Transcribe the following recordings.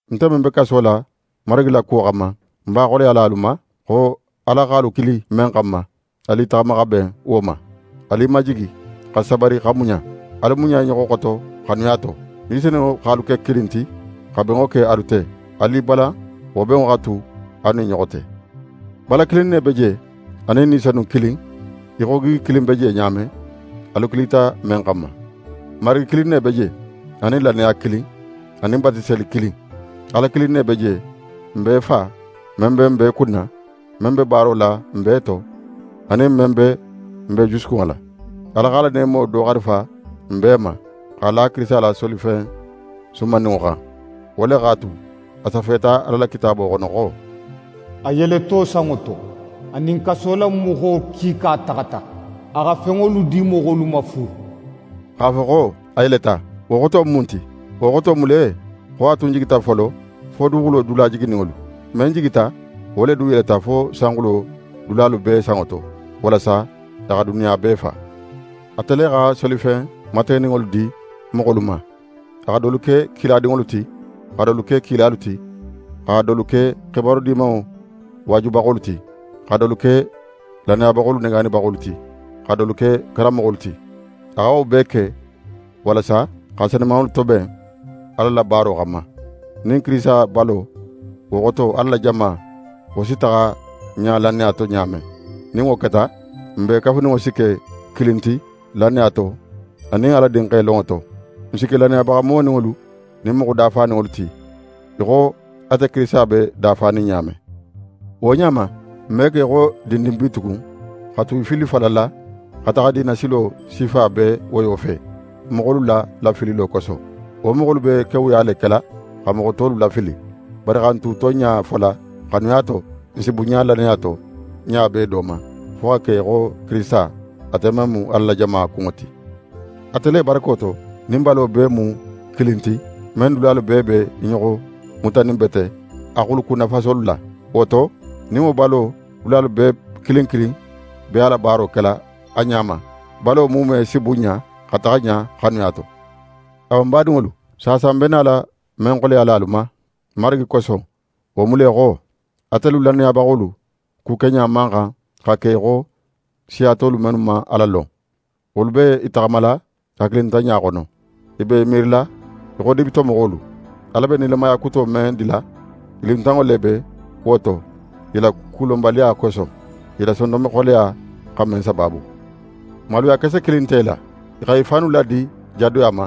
Nte men be kaso la Marigi la kuwo xanma, ń b'a xoleyala alu ma, xo Ala x'alu kili men xanma, alu i taxama xa ben wo ma. Alu i majigi xa sabari xa muɲa. Alu muɲa i ɲoxo xoto xanuya to. Ni Senunŋo x'alu ke kilin ti xa benŋo ke alu te, alu i balan wo benŋo xa tu alu nin i ɲoxo te. Bala kilin ne be je; anin Ni Senun kilin, í xo gigi kilin be je ɲa men, alu kilita men xanma. Marigi kilin ne be je, anin lannaya kilin, anin batiseli kilin. Ala kilin ne be je, n bee Fa, men be n bee kunna, men be baaro la n bee to, anin men be n bee jusukunŋo la. Ala x'a la neemo do xarifa n bee ma, x'a la Kirisita la solifen sumanninŋo xan. Wo le x'a tu, a safeta Ala la Kitaabo xono xo: «A yeleto sanŋo to, a nin kasolamoxo kiika taxata; a xa fenŋolu di moxolu ma fu.» X'a fo xo: «A yeleta», wo xoto mu mun ti? Wo xoto mu le xo a tun jigita folo, fo duguxulo dula jigininŋolu. Men jigita, wo le du yeleta fo sanxulo dulalu bee sanŋo to, walasa a xa duniya bee fa. Ate le xa solifen mategeninŋolu di moxolu ma. A xa dolu ke kiladinŋolu ti, xa dolu ke kilalu ti, xa dolu ke xibaru Dimanŋo waajubaxolu ti, xa dolu ke lannayabaxolu negaanibaxolu ti, xa dolu ke karanmoxolu ti. A xa wo bee ke, walasa xa senumanŋolu toben Ala la baaro xanma, nin Kirisita balo, wo xoto Ala la jama, wo si taxa ɲa lannaya to ɲa men. Nin wo keta, n bee kafuninŋo si ke kilin ti lannaya to, anin Ala Dinxe lonŋo to. N si ke lannayabaxa moninŋolu nin moxo dafaninŋolu ti, í xo ate Kirisita be dafanin ɲa men. Wo ɲa ma, n me ke í xo dindin bitugun, xa tu í fillifallala, xa taxa diina silo sifa bee woyo fe, moxolu la lafililo koso. Wo moxolu be kewuya le kela xa moxo tolu lafili. Bari xa n tu tonɲa fola xanuya to; n si bunɲa lannaya to ɲa bee do ma, fo xa ke í xo Kirisita, ate men mu Ala la jama kunŋo ti. Ate le barako to, nin balo bee mu kilin ti, men dulalu bee be i ɲoxo mutaninbete a xulukunnafasolu la. Wo to, nin wo balo dulalu bee kilin kilin be a la baaro kela a ɲa ma, balo muume si bunɲa xa taxa ɲa xanuya to. Awa ń badinŋolu, saasa ń be nala men xoleyala alu ma, Marigi koso, wo mu le xo: Atelu lannayabaxolu kukeɲa man xan xa ke í xo siya tolu mennu man Ala lon; wolu be i taxamala hakilintanɲa xono. I be i miirila í xo dibitomoxolu. Ala be nilamaya kuto men dila, i luntanŋo le be wo to i la kulonbaliya koso, i la sondonme xoleya xa men sabaabu. Maluya kese kilin nte i la. I xa i fannu ladi jadoya ma,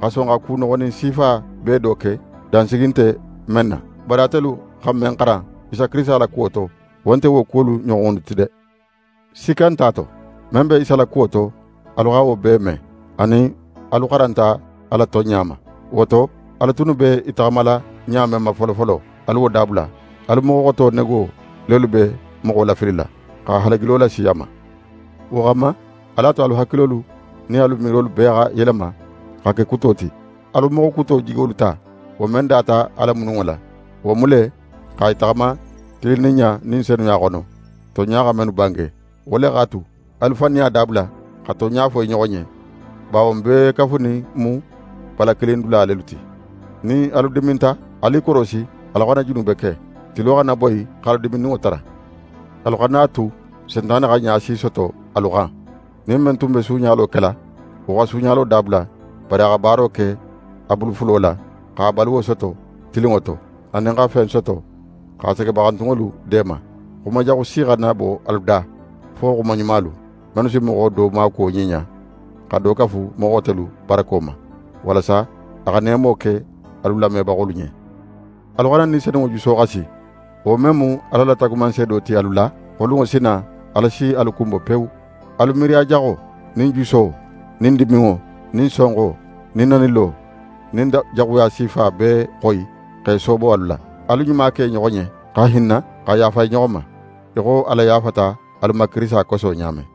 xa son xa ku noxonin sifa bee do ke, dansigi nte men na. Bari atelu xa men xaran Isa Kirisita la kuwo to, wo nte wo kuwolu ɲoxonnu ti de! Sikka nte a to, men be Isa la kuwo to, alu xa wo bee me; anin alu xaranta a la tonɲa ma. Wo to, alu tunnu be i taxamala ɲa men ma folofolo, alu wo dabula. Alu moxo xoto nego lelu be moxo lafilila, xa halagilo lasi a ma. Wo xanma, alu a tu alu hakilolu nin alu miirolu bee xa yelema xa ke kuto ti. Alu moxo kuto jigolu ta, wo men data Ala mununŋo la. Wo mu le xa í taxama tilinninɲa nin senuya xono, tonɲa xa mennu bange. Wo le x'a tu, alu faniya dabula, xa tonɲa fo i ɲoxo ɲen, bawo n bee kafunin mu bala kilin dula lelu ti. Nin alu diminta, alu i korosi alu xana junube ke. Tilo xana boyi x'alu diminninŋo tara. Alu xana a tu Sentane xa ɲa si soto alu xan. Nin men tun be suuɲalo kela, wo xa suuɲalo dabula, bari a xa baaro ke a bulu fulo la, x'a baluwo soto tilinŋo to, anin xa fen soto xa segebaxantunŋolu deema. Xuma jaxu si xana bo alu da, fo xuma ɲumalu, mennu si moxo do maakuwo ɲiɲa, xa do kafu moxo xotelu barako ma, walasa a xa neemo ke alu lamebaxolu ɲen. Alu xana Ni Senunŋo juso xasi, wo men mu Ala la taagumanseedo ti alu la, xo lunŋo si na, Ala si alu kunbo pewu. Alu miiriya jaxo, nin juso, nin diminŋo, nin sonxo, nin nanilo, nin jaxuya sifa bee xoyi x'e soobo alu la. Alu ɲuma ke i ɲoxo ɲen, xa hinna, xa yaafa i ɲoxo ma, í xo Ala yaafata alu ma Kirisita koso ɲa men.